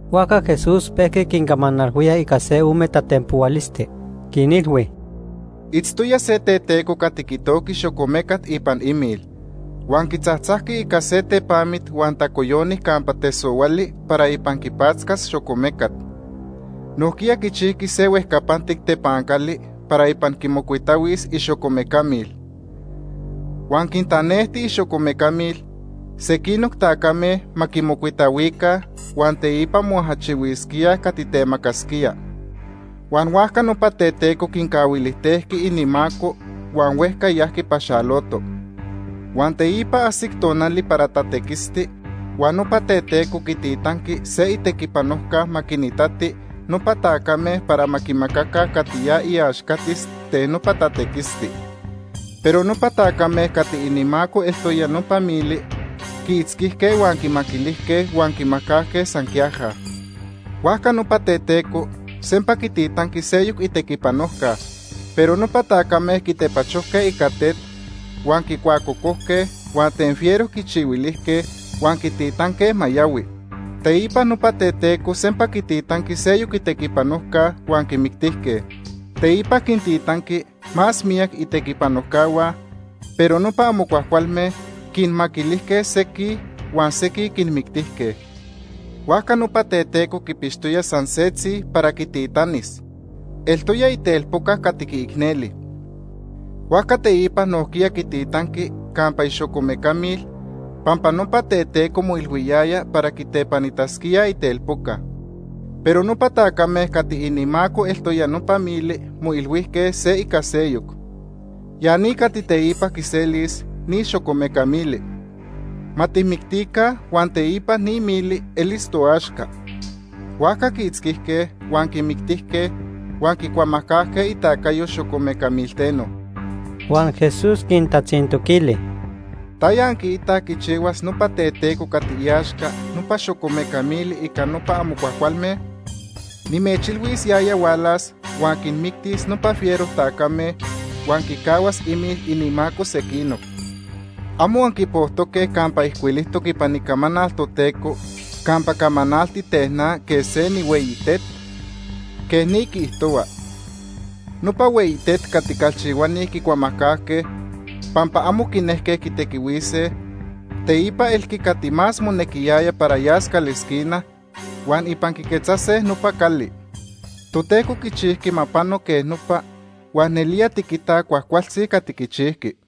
Huajca Jesús pejqui quincamanalhuía ica se ome tatenpohualisti. Quinilhui: “Itztoya se teteco cati quitojqui xocomecat ipan imil. Huan quitzajtzajqui ica se tepamit huan tacoyoni campa tesohuali para ipan quipatzcas xocomecat. Nojquiya quichijqui se huejcapantic tepancali para ipan quimocuitahuis ixocomeca mil. Huan quintanejti ixocomeca mil sequinoc tacame ma quimocuitahuica huan teipa moajachihuisquíaj cati temacasquía. Huan huajca nopa teteco quincahuilijtejqui inimaco huan huejca yajqui paxaloto. Huan teipa ajsic tonali para tatequisti, huan nopa teteco quititanqui se itequipanojca ma quinitati nopa tacame para ma quimacaca cati ya iaxcatis ten nopa tatequisti. Pero nopa tacame cati inimaco eltoya nopa mili quiitzquijque huan quimaquilijque, huan quimajcajque san quiaja. Huajca nopa teteco sempa quititanqui seyoc itequipanojca, pero nopa tacame quitepachojque ica tet huan quicuacocojque huan ten fiero quichihuilijque huan quititanque ma yahui. Teipa nopa teteco sempa quititanqui seyoc itequipanojca, huan quimictijque. Teipa quintitanqui más miyac itequipanojcahua, pero nopa amo cuajcualme quinmaquilijque sequij huan sequij quinmictijque. “Huajca nopa teteco quipixtoya san setzi para quititanis, eltoya itelpoca cati quiicneli. Huajca teipa nojquiya quititanqui campa ixocomeca mil, pampa nopa teteco moilhuiyaya para quitepanitasquíaj itelpoca. Pero nopa tacame cati inimaco eltoya nopa mili moilhuijque se ica seyoc: ‘Ya ni cati teipa quiselis ni xocomeca mili. Ma tijmictica huan teipa ni mili elis toaxca.’ Huajca quiitzquijque, huan quimictijque, huan quicuamajcajque itacayo xocomeca milteno.” Huan Jesús quintatzintoquili: “¿Taya anquiitaj quichihuas nopa teteco cati iaxca nopa xocomeca mili ica nopa amo cuajcualme? Nimechilhuis, yaya hualas, huan quinmictis nopa fiero tacame huan quicahuas imil inimaco sequinoc. ¿Amo anquipojtoque campa ijcuilijtoc ipan Icamanal Toteco campa camanalti ten na quej se nihueyi tet? Quej ni quiijtohua: ‘Nopa hueyi tet cati calchihuani quicuamajcajque pampa amo quinejque quitequihuise, teipa elqui cati más monequiyaya para yas calesquina, huan ipan quiquetzase nopa cali. Toteco quichijqui ma pano quej nopa huan nelía tiquitaj cuajcualtzi cati quichijqui.’”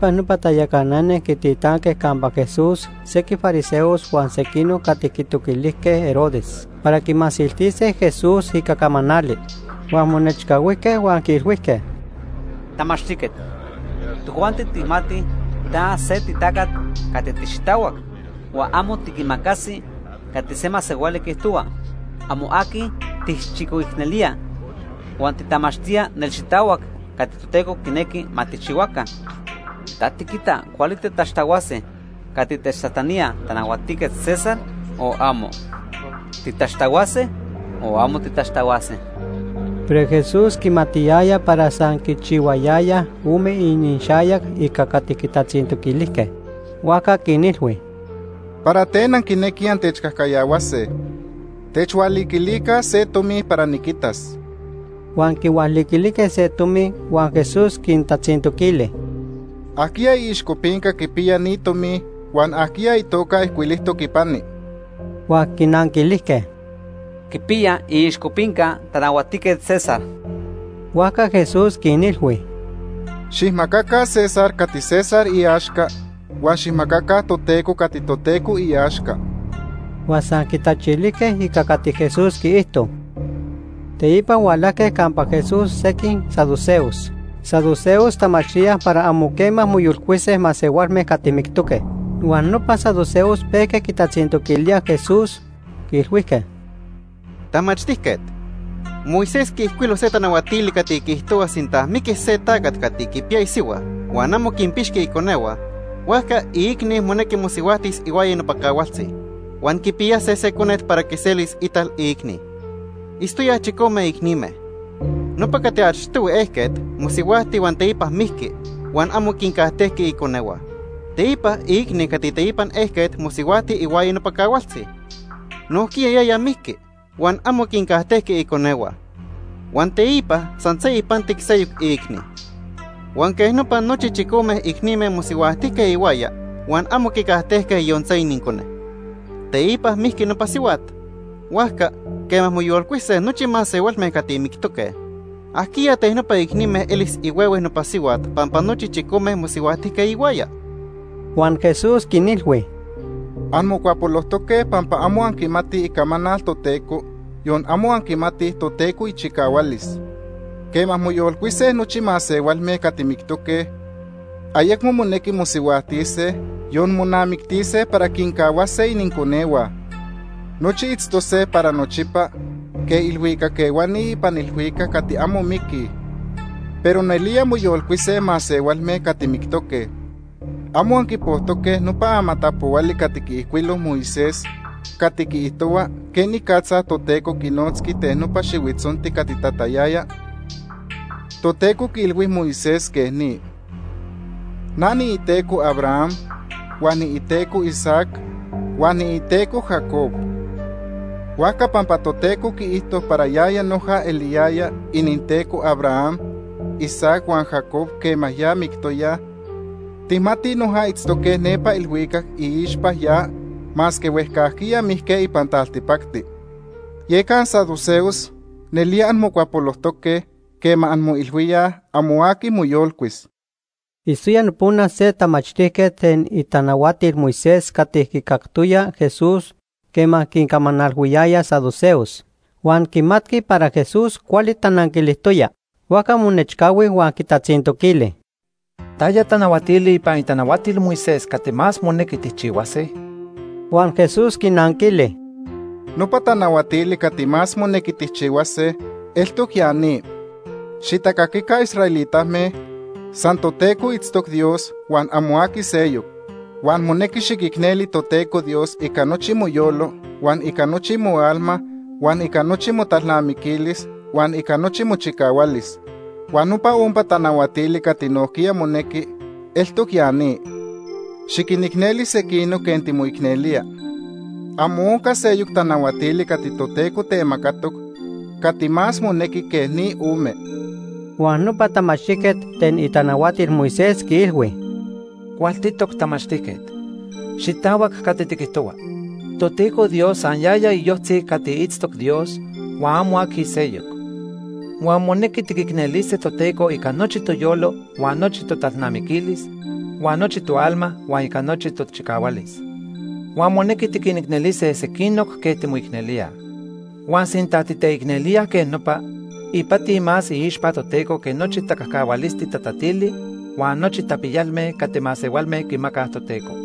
Teipa nopa tayacanani quintitanque campa Jesús sequij fariseos huan sequinoc cati quitoquilijque Herodes para quimasiltise Jesús ica camanali. Huan monechcahuijque huan quiilhuijque: ―Tamachtijquet, tojuanti tijmatij ta se titacat cati tixitahuac, huan amo tiquimacasi cati se masehuali quiijtohua. Amo aqui tijchicoicnelía, huan titamachtía nelxitahuac cati Toteco quinequi ma tijchihuaca. ¿Ta tiquita cuali titaxtahuase cati techtajtanía Tanahuatijquet César, o amo? ¿Titaxtahuase o amo titaxtahuase? Pero Jesús quimatiyaya para san quichihuayayaj ome inixayac ica cati quitatzintoquilijque. Huajca quinilhui: ―¿Para ten anquinequij antechcajcayahuase? Techhualiquilica se tomi para niquitas. Huan quihualiquilijque se tomi, huan Jesús quintatzintoquili: ―¿Ajquiya iixcopinca quipiya ni tomi huan ajquiya itoca ijcuilijtoc ipani? Huan quinanquilijque: ―Quipiya iixcopinca Tanahuatijquet César. Huajca Jesús quinilhui: ―Xijmacaca César cati César iaxca, huan xijmacaca Toteco cati Toteco iaxca. Huan san quitachilijque ica cati Jesús quiijto. Teipa hualajque campa Jesús sequij saduceos. Saduceos tamachtíaj para amo quema moyolcuise masehualme cati mictoque. Huan nopa saduceos pejque quitatzintoquilíaj Jesús, quiilhuijque: ―Tamachtijquet, Moisés techtajcuilhui se tanahuatili cati quiijtohua sinta miquis se tacat cati quipiya isihua huan amo quinpixqui iconehua, huajca iicni monequi mosihuajtis ihuaya nopa cahualtzi, huan quipiyase se conet para quiselis ital iicni. Itztoyaj chicome icnime. Nopa cati achtohui ejquet mosihuajti huan teipa mijqui huan amo quincajtejqui iconehua. Teipa iicni cati teipan ejquet mosihuajti ihuaya nopa cahualtzi. Nojquiya yaya mijqui, huan amo quincajtejqui iconehua. Huan teipa san se ipantic seyoc iicni. Huan quej nopa nochi chicome icnime mosihuajtijque ihuaya huan amo quicajtejque yon se inincone. Teipa mijqui nopa sihuat. Huajca, quema moyolcuise nochi masehualme cati mictoque, ¿ajquiya ten nopa icnime elis ihuehue nopa sihuat pampa nochi chicome mosihuajtijque ihuaya? Huan Jesús quinilhui: ―Anmocuapolojtoque pampa amo anquimatij Icamanal Toteco, yon amo anquimatij Toteco ichicahualis. Quema moyolcuise nochi masehualme cati mictoque, ayecmo monequi mosihuajtise, yon monamictise para quincahuase ininconehua. Nochi itztose para nochipa quej ilhuicac ehuani ipan ilhuicac cati amo miquij. Pero nelía moyolcuise masehualme cati mictoque. ¿Amo anquipojtoque nopa amatapohuali cati quiijcuilo Moisés cati quiijtohua quenicatza Toteco quinotzqui ten nopa xihuitzonti cati tatayaya? Toteco quiilhui Moisés quej ni: ‘Na niiTeco Abraham, huan niiTeco Isaac, huan niiTeco Jacob.’ Huajca pampa Toteco quiijto para yaya noja eliyaya ininTeco Abraham, Isaac, huan Jacob quema ya mictoyaj, tijmatij noja itztoque nepa ilhuicac iixpa ya masque huejcajquiya mijque ipan taltipacti. Yeca ansaduceos nelía anmocuapolojtoque quema anmoilhuíaj amo aqui moyolcuis. Itztoya nopona se tamachtijquet ten itanahuatil Moisés cati quicactoya Jesús quema quincamanalhuiyaya saduceos, huan quimatqui para Jesús cuali tananquilijtoya. Huajca monechcahui huan quitatzintoquili: ―¿Taya tanahuatili ipan itanahuatil Moisés cati más monequi tijchihuase? Huan Jesús quinanquili: ―Nopa tanahuatili cati más monequi tijchihuase eltoc ya ni: ‘Xitacaquica israelitame, san Toteco itztoc Dios huan amo aqui seyoc. Huan monequi xiquicneli Toteco Dios ica nochi moyolo huan ica nochi moalma huan ica nochi motalnamiquilis, huan ica nochi mochicahualis.’ Huan nopa ompa tanahuatili cati nojquiya monequi eltoc ya ni: ‘Xiquinicneli sequinoc quej timoicnelía.’ Amo onca seyoc tanahuatili cati Toteco temacatoc cati más monequi que ni ome. Huan nopa tamachtijquet ten itanahuatil Moisés quiilhui: ―Cualtitoc tamachtijquet. Xitahuac cati tiquijtohua. Toteco Dios san yaya iyojtzi cati itztoc Dios, huan amo aqui seyoc. Huan monequi tiquicnelise Toteco ica nochi toyolo huan nochi totalnamiquilis, huan nochi toalma huan ica nochi tochicahualis. Huan monequi tiquinicnelise sequinoc quej timoicnelíaj. Huan sinta titeicnelíaj quej nopa, ipati más iixpa Toteco que nochi tacajcahualisti tatatili huan nochi tapiyalme cati masehualme quimacaj Toteco.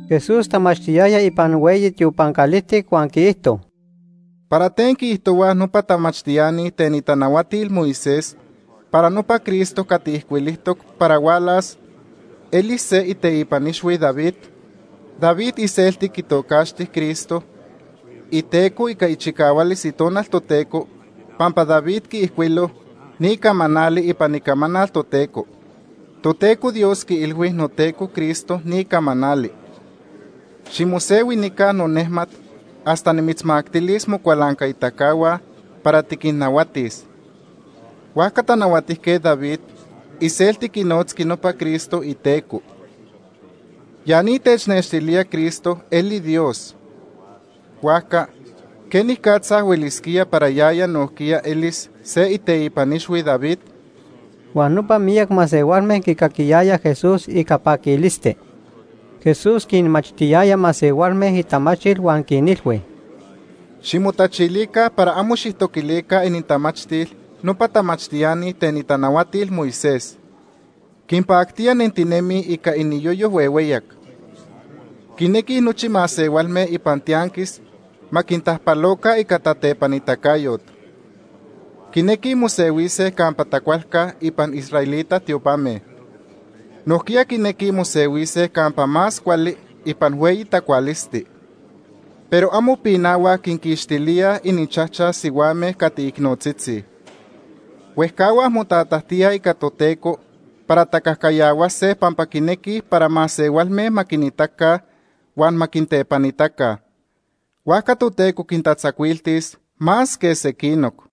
Jesús tamachtiyaya ipan hueyi tiopan calijtic huan quiijto: ―¿Para ten quiijtohuaj nopa tamachtiani ten itanahuatil Moisés para nopa Cristo cati ijcuilijtoc para hualas elis se iteipan ixhui David? David iselti quitocaxti Cristo iTeco ica ichicahualis Itonal Toteco, pampa David quiijcuilo ni camanali ipan Icamanal Toteco: ‘Toteco Dios quiilhui noTeco Cristo ni camanali: Ximosehui nica nonejmat hasta nimitzmactilis mocualancaitacahua para tiquinnahuatis.’ Huajca Tanahuatijquet David iselti quinotzqui nopa Cristo iTeco. Ya ni technextilía Cristo eli Dios. Huajca ¿quenicatza huelisquía para yaya nojquiya elis se iteipan ixhui David? Huan nopa miyac masehualme quicaquiyayaj Jesús ica paquilisti. Jesús quinmachtiyaya masehualme itamachtil huan quinilhui: “Ximotachilica para amo xijtoquilica inintamachtil nopa tamachtiani ten itanahuatil Moisés. Quinpactía nentinemij ica iniyoyo huehueyac. Quinequij nochi masehualme ipan tianquis ma quintajpaloca ica tatepanitacayot. Quinequij mosehuise campa tacualca ipan israelita tiopame. Nojquiya quinequij mosehuise campa más cuali ipan hueyi tacualisti. Pero amo pinahuaj quinquixtilíaj ininchajchaj sihuame cati icnotzitzi. Huejcahuaj motatajtíaj ica Toteco para tacajcayahuase pampa quinequij para masehualme ma quinitaca huan ma quintepanitaca. Huajca Toteco quintatzacuiltis más que sequinoc.”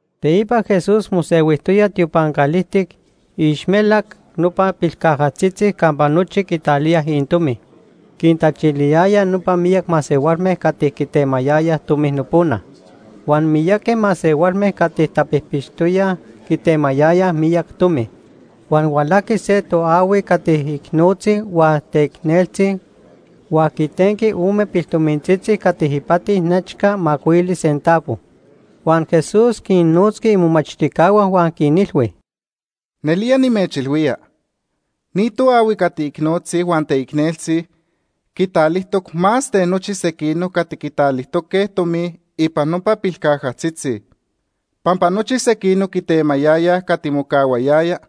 Teipa Jesús mosehuijtoya tiopan calijtic iixmelac nopa pilcajatzitzi campa nochi quitalíaj inintomi. Quintachiliyaya nopa miyac masehualme cati quitemayayaj tomi nopona. Huan miyaqui masehualme cati tapijpixtoyaj quitemayayaj miyac tomi. Huan hualajqui se toahui cati icnotzi huan teicneltzi huan quitenqui ome piltomintzitzi cati ipati nechca macuili centavo. Huan Jesús quinnotzqui imomachtijcahua huan quinilhui: ―Nelía nimechilhuía, ni toahui cati icnotzi huan teicneltzi quitalijtoc más ten nochi sequinoc cati quitalijtoque tomi ipan nopa pilcajatzitzi. Pampa nochi sequinoc quitemayayaj cati mocahuayaya,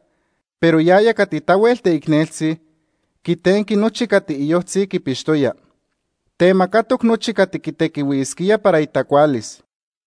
pero yaya cati tahuel teicneltzi, quitenqui nochi cati iyojtzi quipixtoya. Temacatoc nochi cati quitequihuisquía para itacualis.